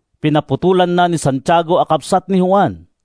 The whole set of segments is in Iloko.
Pinaputolanna ni Santiago a kabsat ni Juan.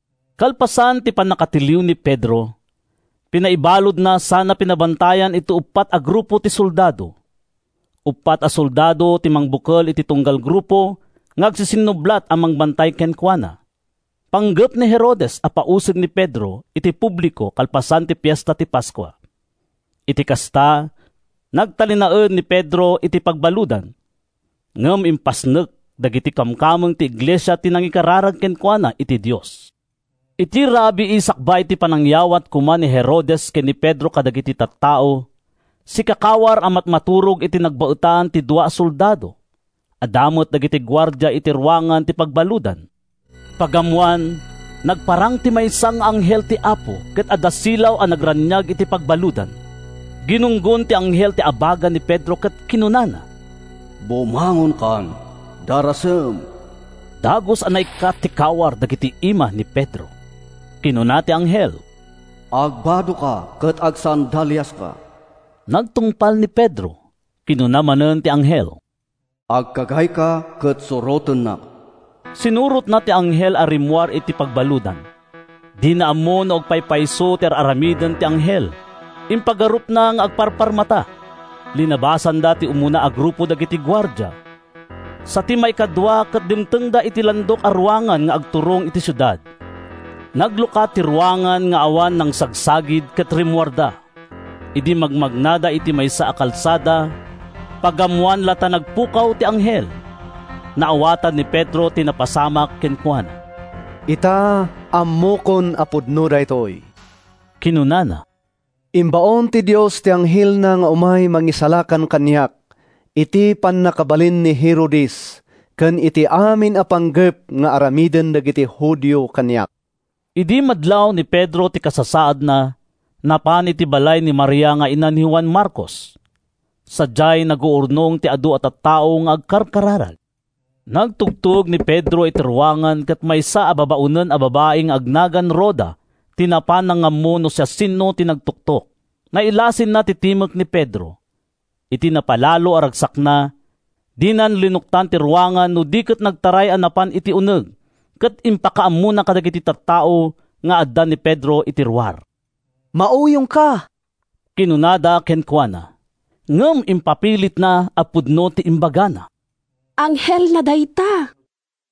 Kalpasan ti pannakatiliw ni Pedro, pinaibaludna sana pinabantayan iti uppat a grupo ti soldado. Uppat a soldado ti mangbukel iti tunggal grupo nga agsisinnublat a mangbantay kenkuana. Panggep ni Herodes a pausig ni Pedro iti publiko kalpasan ti Fiesta ti Paskua. Iti kasta, nagtalinaed ni Pedro iti pagbaludan. Ngem impasnek dagiti kamkameng ti iglesia ti nangikararag kenkuana iti Dios. Iti rabii sakbay ti panangyawat koma ni Herodes ken ni Pedro kadagiti tattao, sikakawar a matmaturog iti nagbaetan ti dua a soldado. Adda met dagiti guardia iti ruangan ti pagbaludan. Pagammoan, nagparang ti maysa nga anghel ti Apo ket adda silaw a nagraniag iti pagbaludan. Ginunggon ti anghel ti abaga ni Pedro ket kinunana, “Bumangonkan! Darasem!” Dagus a naikkat ti kawar dagiti ima ni Pedro. Kinuna ti anghel, “Agbadoka ket agsandaliaska!” Nagtungpal ni Pedro. Kinuna manen ti anghel, “Agkagayka ket surotennak.” Sinurotna ti anghel a rimmuar iti pagbaludan. Dina ammo no agpaypayso ti ar-aramiden ti anghel. Impagarupna nga agparparmata. Linabasanda ti umuna a grupo dagiti guardia, sa ti maikadua ket dimtengda iti landok a ruangan nga agturong iti siudad. Naglukat ti ruangan nga awan nangsagsagid ket rimmuarda. Idi magmagnada iti maysa a kalsada, pagammoan la ta nagpukaw ti anghel. Naawatan ni Pedro ti napasamak kenkuana. “Ita, ammokon a pudno daytoy,” kinunana. “Imbaon ti Dios ti anghelna nga umay mangisalakan kaniak iti pannakabalin ni Herodes ken iti amin a panggep nga aramiden dagiti Judio kaniak.” Idi madlaw ni Pedro ti kasasaadna, napan iti balay ni Maria nga ina ni Juan Marcos. Sadiay, naguurnong ti adu a tattao nga agkarkararag. Nagtugtog ni Pedro iti ruangan ket maysa a babaonen a babai nga agnagan Roda ti napan nangammo no siasino ti nagtuktok. Nailasinna ti timek ni Pedro. Iti napalalo a ragsakna, dinan linuktan ti ruangan no di ket nagtaray a napan iti uneg ket impakaammona kadagiti tattao nga adda ni Pedro iti ruar. “Mauyongka!” kinunada kenkuana. Ngem impapilitna a pudno ti imbagana. “Anghelna dayta,”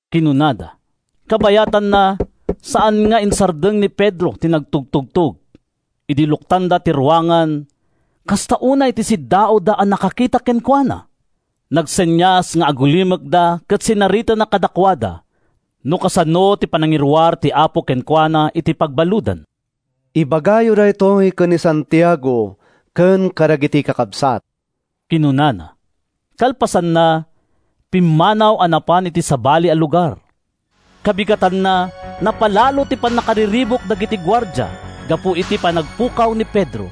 kinunada. Kabayatanna, saan nga insardeng ni Pedro ti nagtugtugtog. Idi luktanda ti ruangan, kasta unay ti siddaawda a nakakita kenkuana. Nagsenias nga agulimekda ket sinaritana kadakuada no kasano ti panangiruar ti Apo kenkuana iti pagbaludan. “Ibagayo daytoy ken ni Santiago ken kadagiti kakabsat,” kinunana. Kalpasanna, pimmanaw a napan iti sabali a lugar. Kabigatanna, napalalo ti pannakariribuk dagiti guardia gapu iti panagpukaw ni Pedro.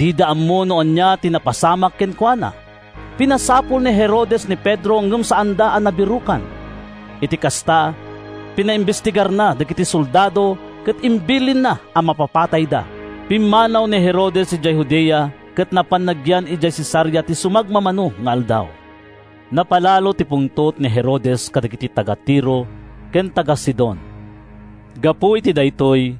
Dida ammo no ania ti napasamak kenkuana. Pinasapul ni Herodes ni Pedro ngem saanda a nabirokan. Iti kasta, pinaimbestigarna dagiti soldado ket imbilinna a mapapatayda. Pimmanaw ni Herodes idiay Judea ket napan nagyan idiay Cesarea iti sumagmamano nga aldaw. Napalalo ti pungtot ni Herodes kadagiti taga-Tiro ken taga-Sidon. Gapu iti daytoy,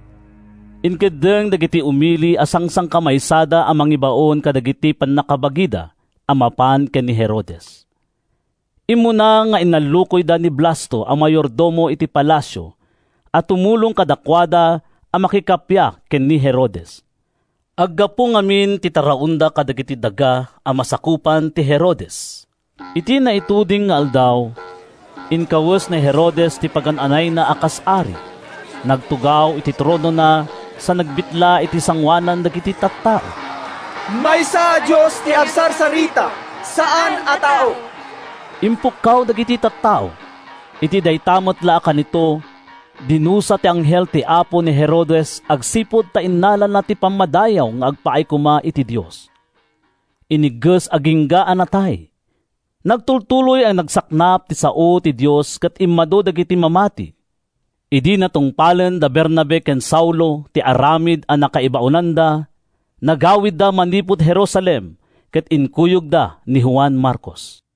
inkeddeng dagiti umili a sangsangkamaysada a mangibaon kadagiti pannakabagida a mapan ken ni Herodes. Immuna nga inallukoyda ni Blasto a mayordomo iti palasio a tumulong kadakuada a makikappia ken ni Herodes. Aggapu ngamin ti taraonda kadagiti daga a masakupan ti Herodes. Iti naituding nga aldaw, inkawes ni Herodes ti pagan-anayna a kas ari, nagtugaw iti tronona sa nagbitla iti sangoanan dagiti tattao. “Maysa a dios ti agsarsarita, saan a tao!” impukkaw dagiti tattao. Iti dayta met la a kanito, dinusa ti anghel ti Apo ni Herodes agsipud ta innalana ti pammadayaw nga agpaay koma iti Dios. Inigges agingga a natay. Nagtultuloy a nagsaknap ti sao ti Dios ket immadu dagiti mamati. Idi natungpalen da Bernabe ken Saulo ti aramid a nakaibaonanda, nagawidda manipud Jerusalem ket inkuyogda ni Juan Marcos.